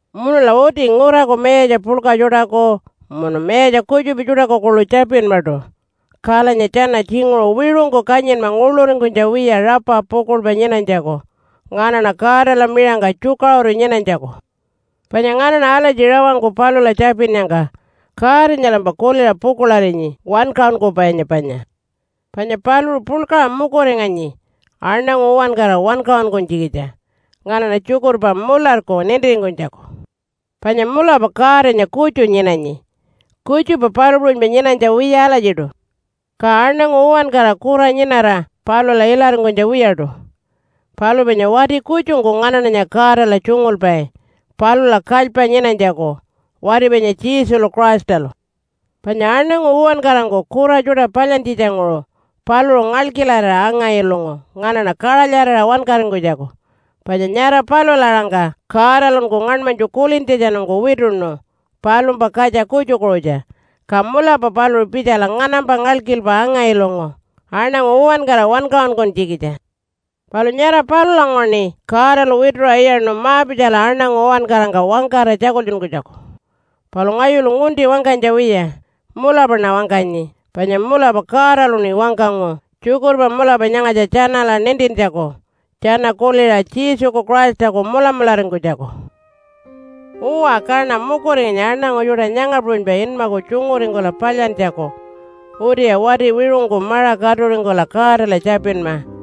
Munula uti nguraku mayatja puḻka tjuṯaku, munu mayatja kutjupa tjuṯaku kuḻu tjapinmaṯu. Kalanya tjana tjinguṟu wiṟungku kanyinma nguḻuringkunytja wiya rapa pukuḻpa nyinanytjaku, nganaṉa Godala miṟangka tjukaṟuru nyinanytjaku. Panya nganaṉa alatji rawangku palula tjapinnyangka Godanyalampa kuliṟa pukuḻarinyi, wankaṟunkupainya panya. Panya paluṟu puḻkaṟa mukuringanyi aṉangu uwankara wankaṟunkunytjikitja nganaṉa tjukurpa mularku nintiringkunytjaku. Panya mulapa Godanya kutju nyinanyi. Kutjupa palu puṟunypa nyinanytja wiya alatjiṯu. Ka aṉangu uwankara kura nyinara palula ilaringkunytja wiyaṯu. Palu panya wati kutjungku nganaṉanya Godala tjungulpai palula kalypa nyinanytjaku, wati panya Jesulu Christalu. Panya aṉangu uwankarangku kura tjuṯa palyantjitjanguṟu paluṟu ngalkilarira anga-ilungu nganaṉa kaṟalyarira wankaringkunytjaku. Panya nyara palula aṟangka Godalunku ngaṉmanytju kulintjatjanungku wituṉu palumpa katja kutjukuṟutja, ka mulapa paluṟu pitjala nganampa ngalkilpa anga-ilungu aṉangu uwankara wankaṟunkunytjikitja. Palu nyara palulanguṟuṉi Godalu wituṟa iyaṉu ma-pitjala aṉangu uwankarangka wangkara tjakultjunkunytjaku. Palu ngayulu ngunti wangkanytja wiya, mulapaṉa wangkanyi, panya mulapa Godaluṉi wangkangu tjukurpa mulapa nyangatja tjanala nintintjaku tjana kuliṟa Jesuku Christaku mulamularingkunytjaku. Uwa, kaṉa mukuringanyi aṉangu tjuṯa nyanga puṟunypa inmaku tjunguringkula palyantjaku utiya wati wiṟungku maṟa katuringkula Godala tjapinma.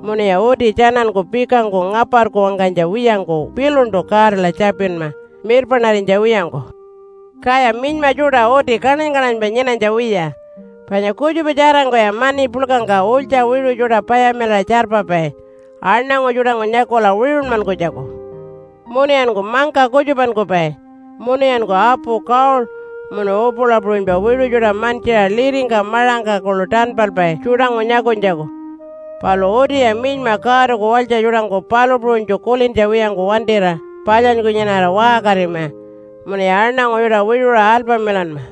Munuya uti tjananku pikangku ngaparku wangkanytja wiyangku piluntu Godala tjapinma mirpaṉarinytja wiyangku. Kaya minyma tjuṯa uti kaṉany-kaṉanypa nyinanytja wiya. Panya kutjupa tjarangkuya mani puḻkangka ulytja wiṟu tjuṯa payamilaṟa tjarpapai aṉangu tjuṯangku nyakula wiṟunmankunytjaku. Munuyanku mangka kutjupankupai, munuyanku apu gold munu upula puṟunypa wiṟu tjuṯa mantjiṟa liringka maṟangka kuḻu tanpalpai tjuṯangku nyakunytjaku. Palu utiya minyma Godaku walytja tjuṯangku palu puṟunytju kulintja wiyangku wantira palyanyku nyinara waṟkarima munuya aṉangu tjuṯa wiṟuṟa alpamilanma.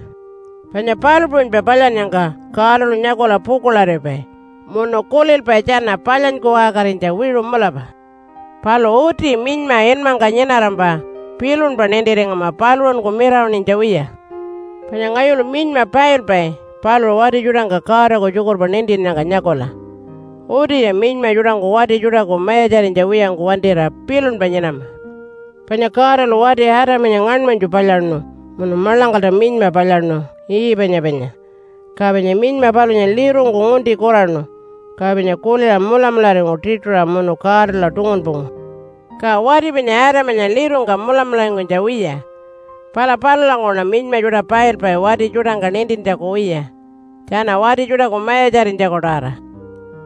Panya palu puṟunypa palyannyangka Godalu nyakula pukuḻaripai munu kulilpai tjana palyanyku waṟkarinytja wiṟu mulapa. Palu uti minyma inmangka nyinarampa pilunpa nintiringama paluṟunku mirawaṉinytja wiya. Panya ngayulu minyma pailpai paluṟu wati tjuṯangka Godaku tjukurpa nintinnyangka nyakula. Utiya minyma tjuṯangku wati tjuṯaku mayatjarinytja wiyangku wantira pilunpa nyinama. Panya Godalu wati Adamanya ngaṉmanytju palyaṉu munu maḻangkalta minyma palyaṉu, Eve-anya panya. Ka panya minyma palunya lirungku ngunti kuraṉu, ka panya kuliṟa mulamularingu tiṯuṟa munu Godala tungunpungu. Ka wati panya Adamanya lirungka mulamularingkunytja wiya. Pala palulanguṟuṉa minyma tjuṯa pailpai wati tjuṯangka nintintjaku wiya, tjana wati tjuṯaku mayatjarinytjaku-tawara.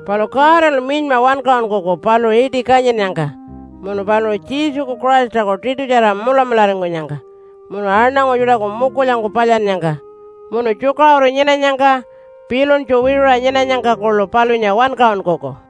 Palu Godalu minyma wankaṟunkuku paluṟu iṯi kanyinnyangka, munu paluṟu Jesuku Christaku tiṯutjara mulamularingkunyangka, munu aṉangu tjuṯaku mukulyangku palyannyangka, munu tjukaṟuru nyinanyangka pilunytju wiṟuṟa nyinanyangka kuḻu palunya wankaṟunkuku.